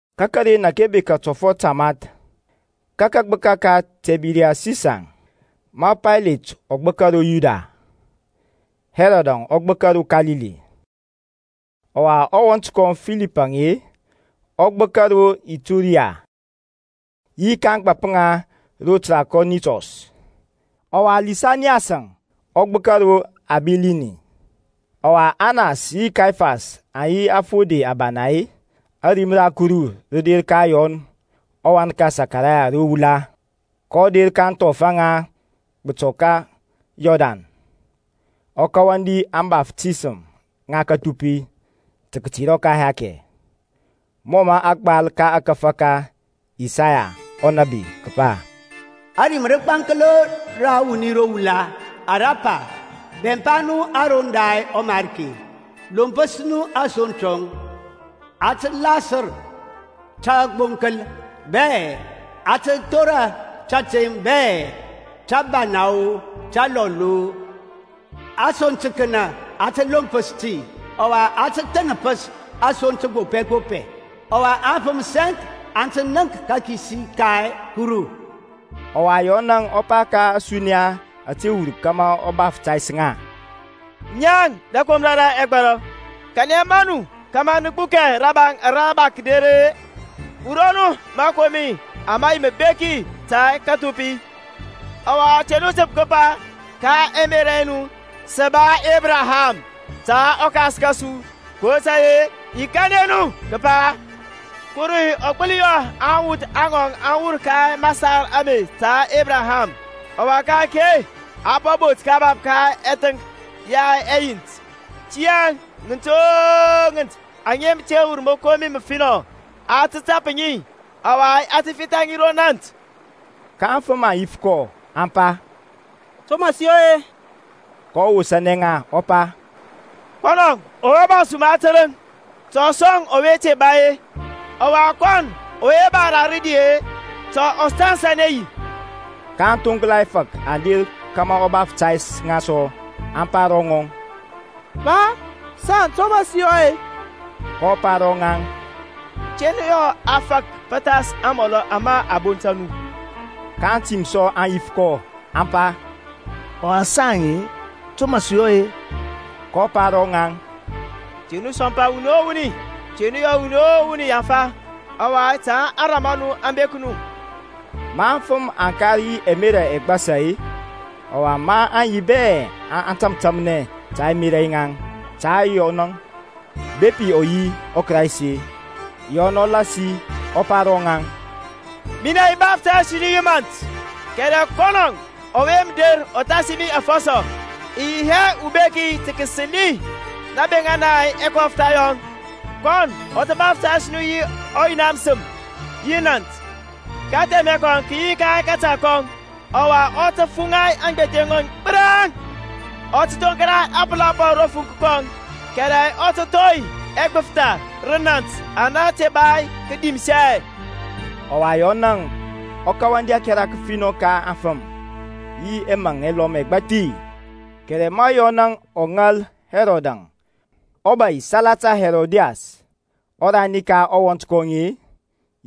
Ka karen ȧke bekȧ tɔfɔt tamath ka kagbəka ka Tibɛrias Sisar, ma Paylet ɔ gbəka ro Yudia, Hɛrɔdȧŋ ɔ gbəka ro Kalili, ɔwa ɔwɔnt kɔŋ Filip-e ɔ gbəka ro Ituriya yi ka ȧŋgbȧp ŋa ro Trakɔnitɔs, ɔwa Lisaniyasȧŋ ɔ gbəkȧ ro Abilini, ɔwa Anas yi Kayafas aŋ yi afode abana-e, ȧrim ra Kuru rə der ka Yɔn ɔwan ka Sakarayas ro wula. kɔ der ka ȧŋthɔf aŋa gbətɔ ka Yɔrdan, ɔ kawandi ȧŋbaftisəm ŋa kəthupi ta katerɔ ka ɛhakɛ; mɔ mə a gbal ka ȧkȧfȧ ka Isaya ɔnȧbi kəpa, Ȧrim rəgbaŋklo ra wuni ro wula ara pa, Bɛmpa nu aroŋ da ɔMarki, Lompəs nu asoŋ tɔŋ. A tə lasər tagboŋkəl bɛ, a tə thora tȧteŋ bɛ, təbana-o, təlɔl-o, Asoŋ təkənə a tə lompəs ti, ɔwa a tə thənəpəs asoŋ təgbopɛ gbopɛ. Ɔwa afəm sɛŋk aŋ tə nənk kakisi ka Kuru. Ɔwa Yɔn ɔ pa ka ȧsuniya ȧte wur kȧmȧ ɔ baftays ŋa, Naŋ rəkomra ra ɛgbɔrɔ, kanɛ maŋ nu kȧmȧ nə gbukɛ rabaŋ ara mə der-e? Wurɔ nu məkomi ama bek ta kəthupi, ɔwa te nu təp kəpa ka ɛmerȧ ɛ nu, Sə ba Ebraham ta ɔkas kȧsu, kotȧy-e i kanɛ nu kəpa, Kuru ɔ gbəli yɔ awuth aŋ wur ka masar ame ta Ebraham. Ɔwa ka-ake a po bot kabap ka ɛthəŋk ya ɛyint. Tiyȧŋ ŋənt o ŋənt aŋa mə te wurɔ məkomi məfinɔ a tə tap ŋi, ɔwa a tə fitha ŋi ro nȧnt. Ka aŋfəm aŋ yif kɔ, aŋ pa, To mə sə yɔ-e? kɔ wosȧnɛ ŋa ɔ pa, Kɔnɔ ɔwe ba suma tərəŋ, ta ɔ sɔŋ ɔwe te ba-e, ɔwa kɔnɔ ɔwe ba ra rədi ta ɔ tansanɛ yi. Ka aŋthoŋkla ɛfȧk aŋ der kȧmȧ ɔ baftays ŋa sɔ, aŋ pa ro ŋɔŋ, Pa, saŋ, to mə sə yɔ-e? kɔ pa ro ŋaŋ, Te nu yɔ a fak pəthas amɔlɔ ama a bonta nu. Ka aŋtim sɔ aŋ yif kɔ, aŋ pa, Ɔwa saŋ-e, to mə sə yɔ-e? kɔ pa ro ŋaŋ, Te nu sɔmpa wuni o wuni, te nu yɔ wuni o wuni yaŋfa, ɔwa ta ȧŋrȧm a nu aŋ bek nu. Ma aŋfəm aŋ kar yi ɛmerȧ ɛgbasa-e, ɔwa maŋ yi bɛ aŋ tȧmtȧmnɛ ka ɛmerȧ yaŋ ta Yɔnȧŋ bepi ɔ yi ɔKraist-e, Yɔn ɔ lasi ɔ pa ro ŋaŋ, Minɛ i baftays nu yi mȧnt, kɛrɛ kɔnɔ ɔwe mə der ɔ thasi mi afɔsɔ, i yi hɛ ubeki tə kəsəli nabeŋa na ɛkɔftha yɔŋ. Kɔnɔ tə baftays nu yi ɔYina məsəm yi nȧnt. Kathɛmɛ kɔŋ kə yi ka kȧta kɔŋ, ɔwa ɔ tə fuŋa aŋgbethe ŋɔŋ gbəraŋ, ɔ tə thoŋkla ȧpəla ro fuŋk kɔŋ, kɛrɛ ɔ tə thɔi ɛgbəftha rə nȧnt ana mə te dimsɛ. Ɔwa Yɔnȧŋ ɔ kawandi ȧkɛra kəfinɔ ka aŋfəm, yi ɛmaŋ ɛlɔm ɛgbathi. Kɛrɛ ma Yɔnȧŋ ɔ ŋal Hɛrɔdȧŋ ɔbȧy salata Herodias ɔrani ka ɔwɔnt kɔŋ-e,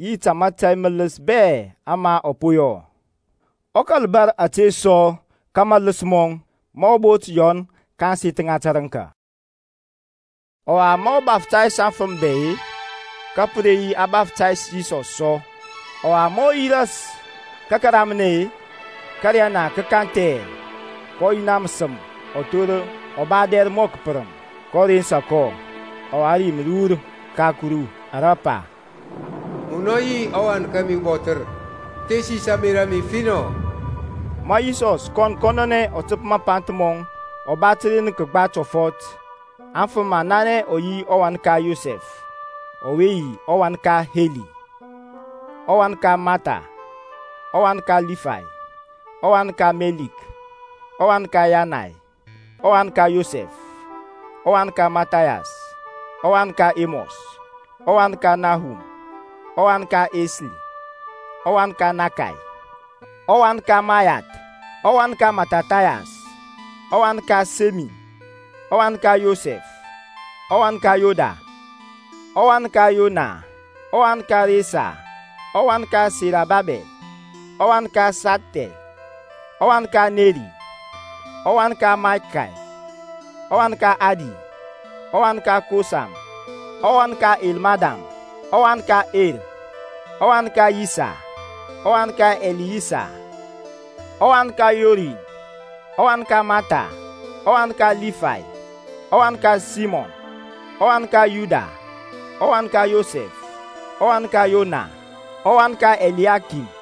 yi ta mȧtȧy mələs bɛ ama ɔ po yɔ, ɔ kȧl bȧr ȧte sɔ ka maləs mɔŋ, ma ɔ bot Yɔn ka ȧŋseth ŋa tərəŋka. Ɔwa ma ɔ baftays aŋfəm bɛ-e, ka pə re yi a baftays Yisɔs sɔ. Ɔwa ma ɔ yi ras ka kəramnɛ-e, ȧkȧriyana kə kanthɛ, ka ɔYina məsəm ɔ thor ɔ ba adɛr mɔ kəpərəm, kɔ rensa kɔ, ɔwa rim rə wur ka ȧkuru ara pa, Munɔ yi ɔWan kȧmi ubɔthər; mə thesis ȧŋmerȧ a mi finɔ. Ma Yisɔs kɔn kɔnɔnɛ ɔ təp mapanth mɔŋ ɔ ba təren kəgba tɔfɔt; aŋfəm aŋ nanɛ ɔ yi ɔwan ka Yosɛf ɔwe yi ɔwan ka Heli, ɔwan ka Mathat, ɔwan ka Lifay, ɔwan ka Meliki, ɔwan ka Yanay, ɔwan ka Yosɛf, ɔwan ka Mathathayas, ɔwan ka Emɔs, ɔwan ka Nahum, ɔwan ka Esli, ɔwan ka Nȧkay, ɔwan ka Mȧyath, ɔwan ka Mathathayas, ɔwan ka Semein, ɔwan ka Yosɛf, ɔwan ka Yoda, ɔwan ka Yoanan, ɔwan ka Resa, ɔwan ka Serobabɛl, ɔwan ka Sialthiɛl, ɔwan ka Neri. ɔwan ka Mɛlki, ɔwan ka Adi, ɔwan ka Kosam, ɔwan ka Elmadam, ɔwan ka Er, ɔwan ka Yisa, ɔwan ka Eliyesa, ɔwan ka Yorim, ɔwan ka Mathat, ɔwan ka Libay, ɔwan ka Simiyɔn, ɔwan ka Yuda, ɔwan ka Yosɛf, ɔwan ka Yonan, ɔwan ka Eliakim,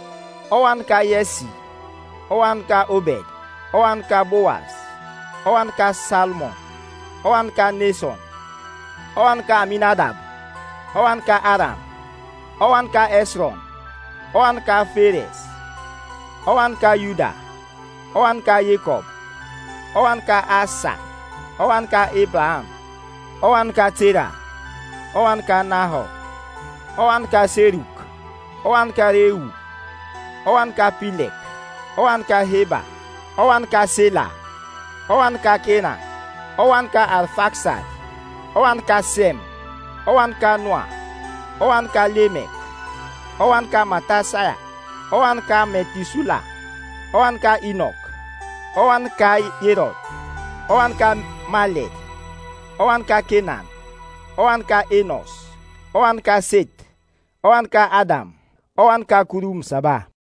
ɔwan ka Yɛsi, ɔwan ka Obed, ɔwan ka Bowas, ɔwan ka Salmon, ɔwan ka Neson, ɔwan ka Aminadab, ɔwan ka Aram, ɔwan ka Hɛsrɔn, ɔwan ka Fares, ɔwan ka Yuda, ɔwan ka Yekɔb, ɔwan ka Aysak, ɔwan ka Ebraham, ɔwan ka Tera, ɔwan ka Nahor, ɔwan ka Seruk, ɔwan ka Reu, ɔwan ka Pilɛk, ɔwan ka Heba, ɔwan ka Sela, ɔwan ka Kenan, ɔwan ka Arfaksad, ɔwan ka Sɛm, ɔwan ka Noa, ɔwan ka Lemek, ɔwan ka Mɛthusala, ɔwan ka Inɔk, ɔwan ka Yerɛd, ɔwan ka Malɛl, ɔwan ka Kenan, ɔwan ka Enos, ɔwan ka Seth, ɔwan ka Adȧm, ɔwan ka Kuru Məsaba.